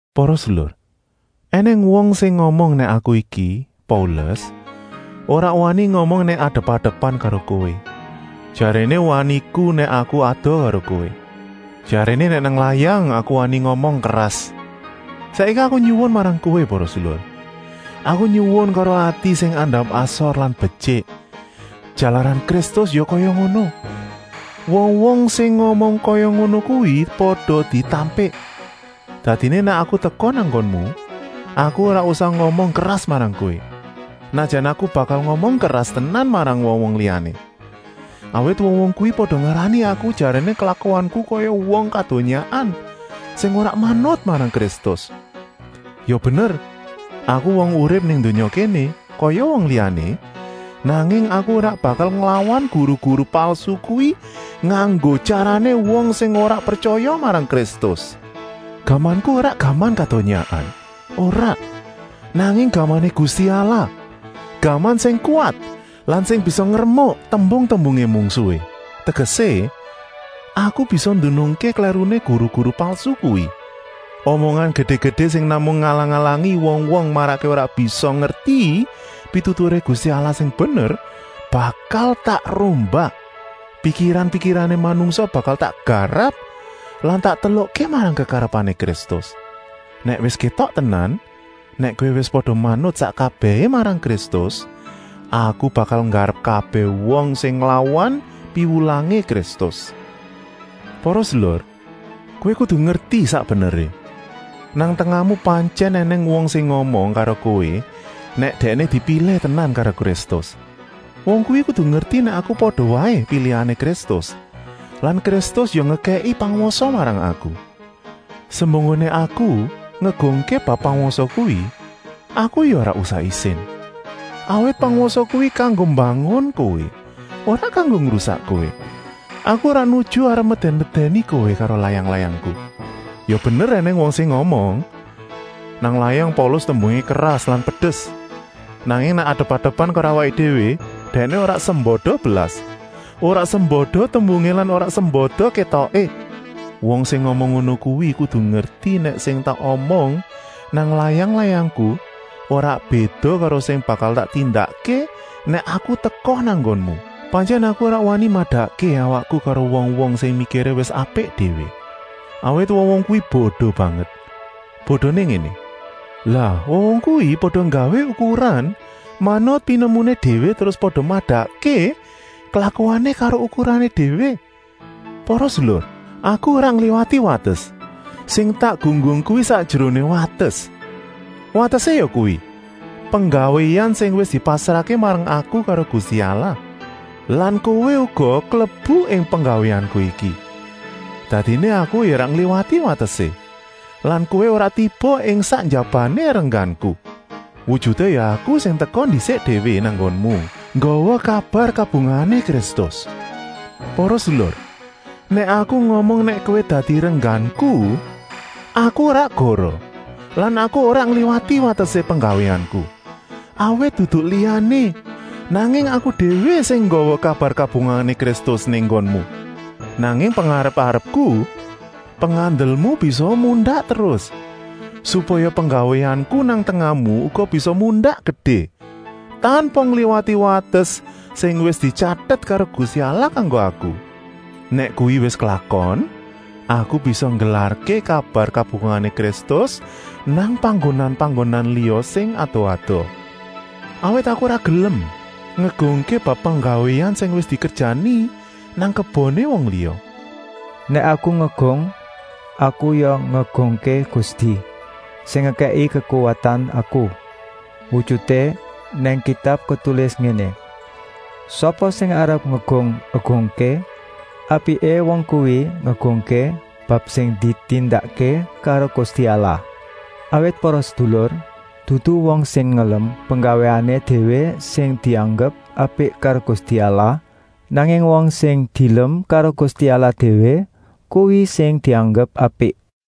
Para sedulur, ènèng wong sing ngomong nèk aku iki, Paulus, ora wani ngomong nèk adep-adepan karo kowé, jaréné waniku nèk aku adoh karo kowé. Jaréné nèk nang layang aku wani ngomong keras. Saiki aku nyuwun marang kowé para sedulur, aku nyuwun karo ati sing andap-asor lan betyik, jalaran Kristus ya kaya ngono: wong-wong sing ngomong kaya ngono kuwi pada ditampik. Dadiné nèk aku teka nang nggonmu, aku ora usah ngomong keras marang kowé, senajan aku bakal ngomong keras tenan marang wong-wong liyané. Awit wong-wong kuwi pada ngarani aku jaréné klakuanku kaya wong kadonyaan, sing ora manut marang Kristus. Ya bener aku wong urip ing donya kéné kaya wong liyané, nanging aku ora bakal nglawan guru-guru palsu kuwi nganggo tyarané wong sing ora pretyaya marang Kristus. Gamanku ora gaman kadonyaan, ora, nanging gamané Gusti Allah, gaman sing kuwat lan sing bisa ngremuk tèbèng-tèbèngé mungsuhé. Tegesé, aku bisa nduduhké klèruné guru-guru palsu kuwi. Omongan gedé-gedé sing namung ngalang-alangi wong-wong marakké ora bisa ngerti pituturé Gusti Allah sing bener, bakal tak rombak. Pikiran-pikirané manungsa bakal tak garap lan tak telukké marang kekarepané Kristus. Nèk wis kétok tenan nèk kowé wis pada manut sak kabèhé marang Kristus, aku bakal nggarap kabèh wong sing nglawan piwulangé Kristus. Para sedulur, kowé kudu ngerti sak beneré. Nang tengahmu pantyèn ènèng wong sing ngomong karo kowé nèk dèkné dipilih tenan karo Kristus. Wong kuwi kudu ngerti nèk aku pada waé pilihané Kristus lan Kristus ya ngekèki pangwasa marang aku. Semunggoné aku ngegungké bab pangwasa kuwi, aku ya ora isin, awit pangwasa kuwi kanggo mbangun kowé, ora kanggo ngrusak kowé. Aku ora nuju arep medèn-medèni kowé karo layang-layangku. Ya bener ènèng wong sing ngomong: “Nang layang Paulus tembungé keras lan pedes, nanging nèk adep-adepan karo awaké déwé dèkné ora sembada blas, ora sembada tembungé lan ora sembada kétoké.” Wong sing ngomong ngono kuwi kudu ngerti nèk sing tak omong nang layang-layangku ora béda karo sing bakal tak tindakké nèk aku teka nang nggonmu. Pantyèn aku ora wani madakké awakku karo wong-wong sing mikiré wis apik déwé, awit wong-wong kuwi bodo banget. Bodoné ngéné: lah wong-wong kuwi pada nggawé ukuran manut pinemuné déwé terus pada madakké klakuané karo ukurané déwé. Para sedulur, nèk aku nggunggung, aku ora ngliwati wates, sing tak gunggung kuwi sakjeroné wates. Watesé yakuwi: penggawéan sing wis dipasrahké marang aku karo Gusti Allah. Lan kowé uga klebu ing penggawéanku iki. Dadiné aku ya ora ngliwati watesé lan kowé ora tiba ing sak njabané rengganku. Wujuté ya aku sing teka ndisik déwé nang nggonmu nggawa kabar kabungahané Kristus. Para sedulur, nèk aku ngomong nèk kowé dadi rengganku, aku ora goroh lan aku ora ngliwati watesé penggawéanku, awit dudu liyané, nanging aku déwé sing nggawa kabar kabungahané Kristus nang nggonmu. Nanging pengarep-arepku, pengandelmu bisaa mundak terus, supaya penggawéanku nang tengahmu uga bisa mundak gedé, tanpa ngliwati wates sing wis dityatet karo Gusti Allah kanggo aku. Nèk kuwi wis klakon, aku bisa nggelarké kabar kabungahané Kristus nang panggonan-panggonan liya sing adoh-adoh. Awit aku ora gelem ngegungké bab penggawéan sing wis dikerjani nang keboné wong liya. Nèk aku ngegung, aku ya ngegungké Gusti, sing ngekèki kekuwatan aku. Wujuté nang Kitab ketulis ngéné: “Sapa sing arep ngegung-egungké, apiké wong kuwi ngegungké bab sing ditindakké karo Gusti Allah.” Awit para sedulur, dudu wong sing ngelem penggawéané déwé sing dianggep apik karo Gusti Allah, nanging wong sing dielem karo Gusti Allah déwé, kuwi sing dianggep apik.